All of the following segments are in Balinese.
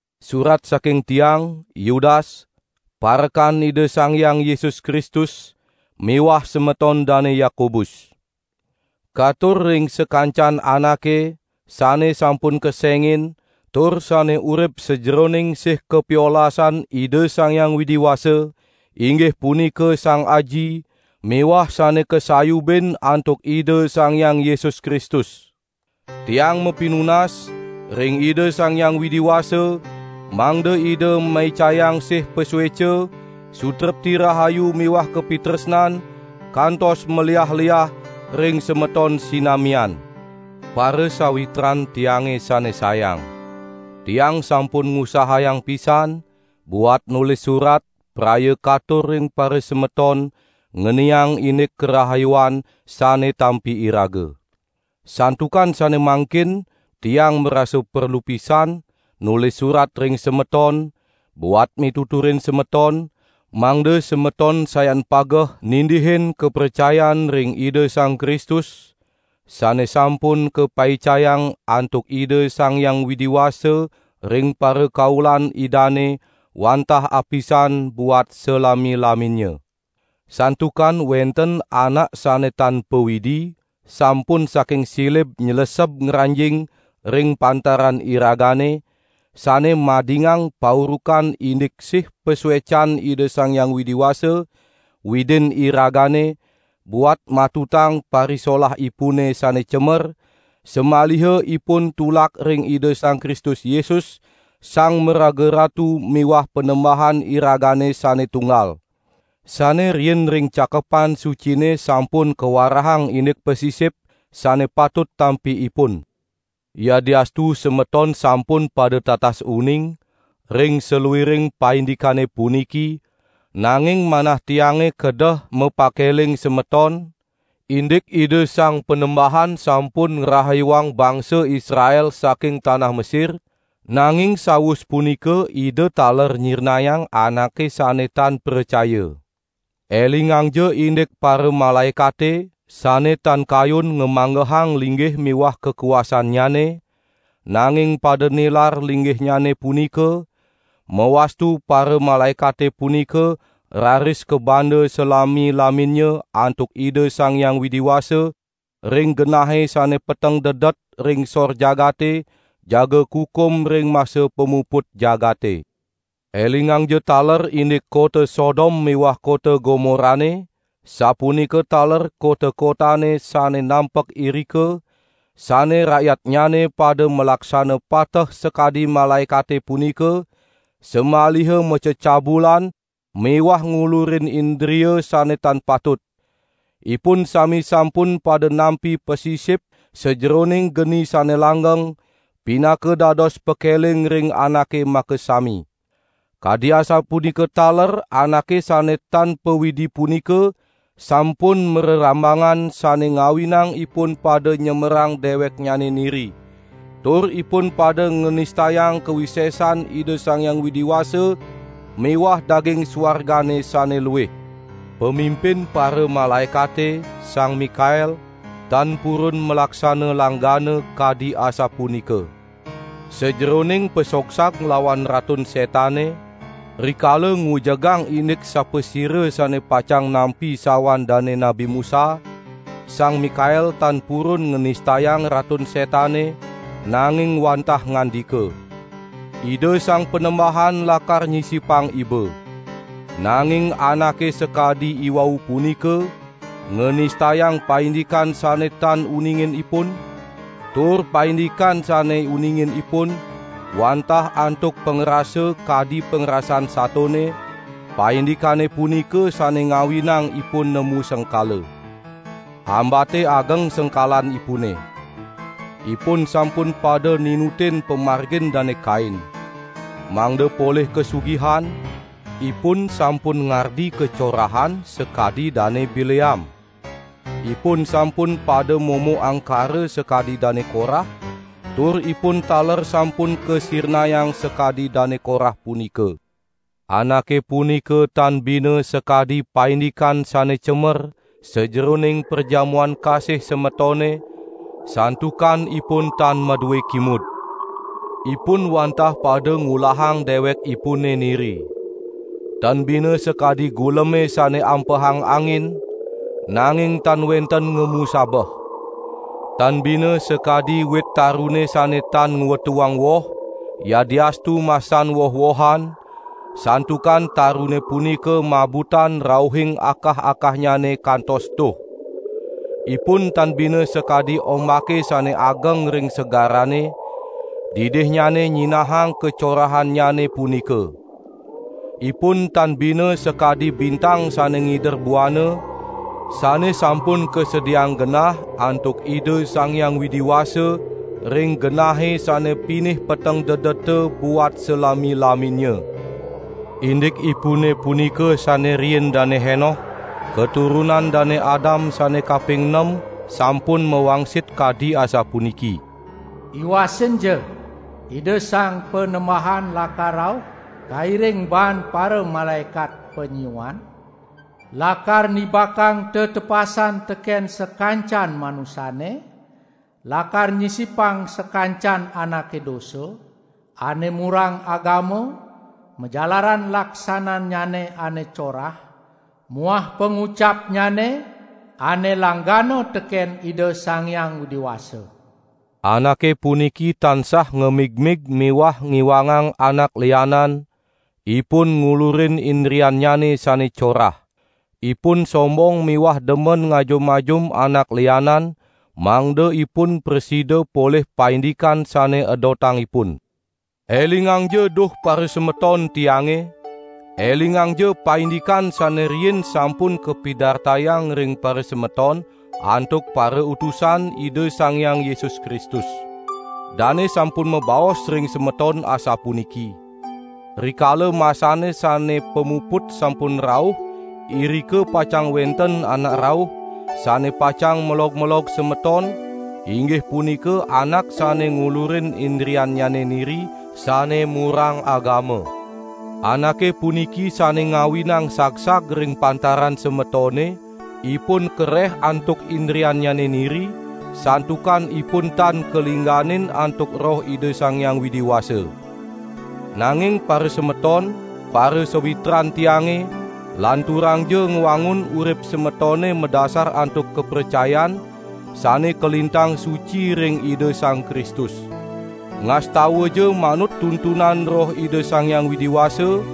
Surat saking tiang, Yudas, parekan Ida Sang Hyang Yesus Kristus miwah semeton Dane Yakobus. Katur ring sakancan anake sane sampun kesengin tur sane urip sajeroning sih kapiolasan Ida Sang Hyang Widi Wasa, inggih punika Sang Aji miwah sane kasayubin antuk Ida Sang Hyang Yesus Kristus. Tiang mapinunas ring Ida Sang Hyang Widi Wasa, mangda Ida maicayang sih pasueca, sutrepti rahayu miwah kapitresnan kantos maliah-liah ring semeton sinamian. Parasawitran tiange sane sayang! Tiang sampun ngusahayang pisan buat nulis surat praya katur ring parasemeton ngeniang indik karahayuan sane tampi iraga; santukan sane mangkin tiang marasa perlu pisan nulis surat ring semeton, buat mituturin semeton, mangda semeton sayan pageh nindihin kapracayan ring Ida Sang Kristus, sane sampun kapaicayang antuk Ida Sang Hyang Widi Wasa ring parakaulan Idane wantah apisan buat salami-laminnya. Santukan wenten anak sane tan pa-Widi sampun saking silib nyleseb ngranjing ring pantaran iragane, sane madingang paurukan indik sih pasuecan Ida Sang Hyang Widi Wasa, Widin iragane, buat matutang parisolahipune sane cemer, samaliha ipun tulak ring Ida Sang Kristus Yesus, Sang Maraga Ratu miwah Panembahan iragane sane tunggal. Sane riin ring Cakepan Sucine sampun kawarahang indik pasisip, sane patut tampi ipun. Yadiastu semeton sampun pada tatas uning ring saluiring paindikane puniki, nanging manah tiange kedeh mapakeling semeton, indik Ida Sang Panembahan sampun ngrahayuang bangsa Israel saking tanah Mesir, nanging sawus punika Ida taler nyirnayang anake sane tan pracaya. Elingangja indik paramalaekate sane tan kayun ngamanggehang linggih miwah kakuasannyane, nanging pada nilar linggihnyane punika, mawastu paramalaekate punika raris kabanda salami-laminnya antuk Ida Sang Hyang Widi Wasa ring genahe sane peteng dedet ring sor jagate, jaga kukum ring masa pamuput jagate. Elingangja taler indik kota Sodom miwah kota Gomorane, sapunika taler kota-kotane sane nampek irika, sane rakyatnyane pada malaksana pateh sakadi malaekate punika, samaliha macecabulan miwah ngulurin indria sane tan patut; ipun sami sampun pada nampi pasisip sajeroning geni sane langgeng, pinaka dados pakeling ring anake makasami. Kadi asapunika taler anake sane tan pa-Widi punika sampun marerambangan sane ngawinang ipun pada nyemerang deweknyane niri; tur ipun pada nganistayang kawisesan Ida Sang Hyang Widi Wasa miwah daging suargane sane luih. Pamimpin paramalaekate Sang Mikael, tan purun malaksana langgana kadi asapunika. Sajeroning pasogsag nglawan Ratun Setane, rikala ngujegang indik sapasira sane pacang nampi sawan dane Nabi Musa, Sang Mikael tan purun nganistayang Ratun Setane, nanging wantah ngandika: "Ida Sang Panembahan lakar nyisipang iba." Nanging anake sakadi iwau punika nganistayang paindikan sane tan uningin ipun; tur paindikan sane uningin ipun wantah antuk pangrasa kadi pangrasan satone, paindikane punika sane ngawinang ipun nemu sengkala. Ambate ageng sengkalanipune! Ipun sampun pada ninutin pamargin Dane Kain. Mangda polih kasugihan, ipun sampun ngardi kacorahan sakadi Dane Bileam. Ipun sampun pada momo angkara sakadi Dane Korah, tur ipun taler sampun kasirnayang sakadi Dane Korah punika. Anake punika tan bina sakadi paindikan sane cemer sajeroning perjamuan kasih semetone, santukan ipun tan madue kimud. Ipun wantah pada ngulahang dewekipune niri. Tan bina sakadi guleme sane ampehang angin, nanging tan wenten ngemu sabeh. Tan bina sakadi wit tarune sane tan ngwetuang woh, yadiastu masan woh-wohan, santukan tarune punika mabutan rauhing akah-akahnyane kantos tuh. Ipun tan bina sakadi ombake sane ageng ring segarane, didihnyane nyinahang kacorahannyane punika. Ipun tan bina sakadi bintang sane ngider buana, sane sampun kasediaang genah antuk Ida Sang Hyang Widi Wasa ring genahe sane pinih peteng dedeta buat salami-laminnya. Indikipune punika sane riin Dane Henoh, katurunan Dane Adam sane kaping nem sampun mawangsit kadi asapuniki: "Iwasinja! Ida Sang Panembahan lakar rauh, kairing baan paramalaekat panyiuan, lakar nibakang tetepasan teken sakancan manusane, lakar nyisipang sakancan anake dosa, ane murang agama, majalaran laksanannyane ane corah muah pangucapnyane ane langgana teken Ida Sang Hyang Widi Wasa." Anake puniki tansah ngamigmig miwah ngiwangang anak lianan; ipun ngulurin indriannyane sane corah. Ipun sombong miwah demen ngajum-ajum anak lianan, mangda ipun prasida polih paindikan sane edotang ipun. Elingangja duh parasemeton tiange! Elingangja paindikan sane riin sampun kapidartayang ring parasemeton antuk parautusan Ida Sang Hyang Yesus Kristus. Dane sampun mabaos ring semeton asapuniki: "Rikala masane sane pamuput sampun rauh irika pacang wenten anak rauh, sane pacang melog-melog semeton, inggih punika anak sane ngulurin indriannyane niri sane murang agama." Anake puniki sane ngawinang sagsag ring pantaran semetone, ipun kareh antuk indriannyane niri, santukan ipun tan kalingganin antuk Roh Ida Sang Hyang Widi Wasa. Nanging parasemeton, parasawitran tiange, lanturangja ngwangun urip semetone madasar antuk kapracayan sane kalintang suci ring Ida Sang Kristus. Ngastawaja manut tuntunan Roh Ida Sang Hyang Widi Wasa,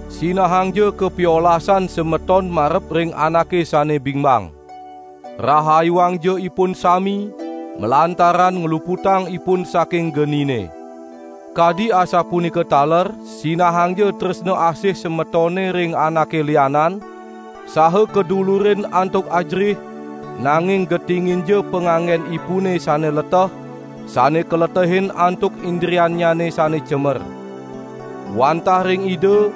Sinahangja kapiolasan semetone marep ring anake sane bingbang. Rahayuangja ipun sami, malantaran ngluputang ipun saking genine. Kadi asapunika taler sinahangja tresna asih semetone ring anake lianan, saha kadulurin antuk ajerih, nanging getinginja panganggenipune sane leteh, sane kaletehin antuk indriannyane sane cemer. Wantah ring Ida,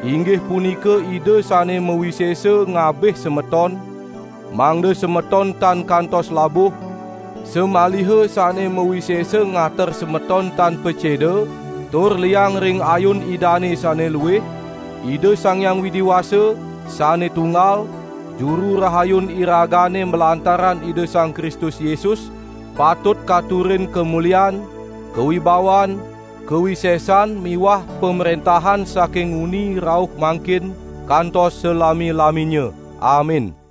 inggih punika Ida sane mawisesa ngabih semeton, mangda semeton tan kantos labuh, samaliha sane mawisesa ngater semeton tan paceda tur liang ring ayun Idane sane luih, Ida Sang Hyang Widi Wasa, sane tunggal, Juru Rahayun iragane malantaran Ida Sang Kristus Yesus, patut katurang kamulian, kawibawan, kawisesan miwah pamrentahan saking nguni rauh mangkin kantos salami-laminnya. Amin.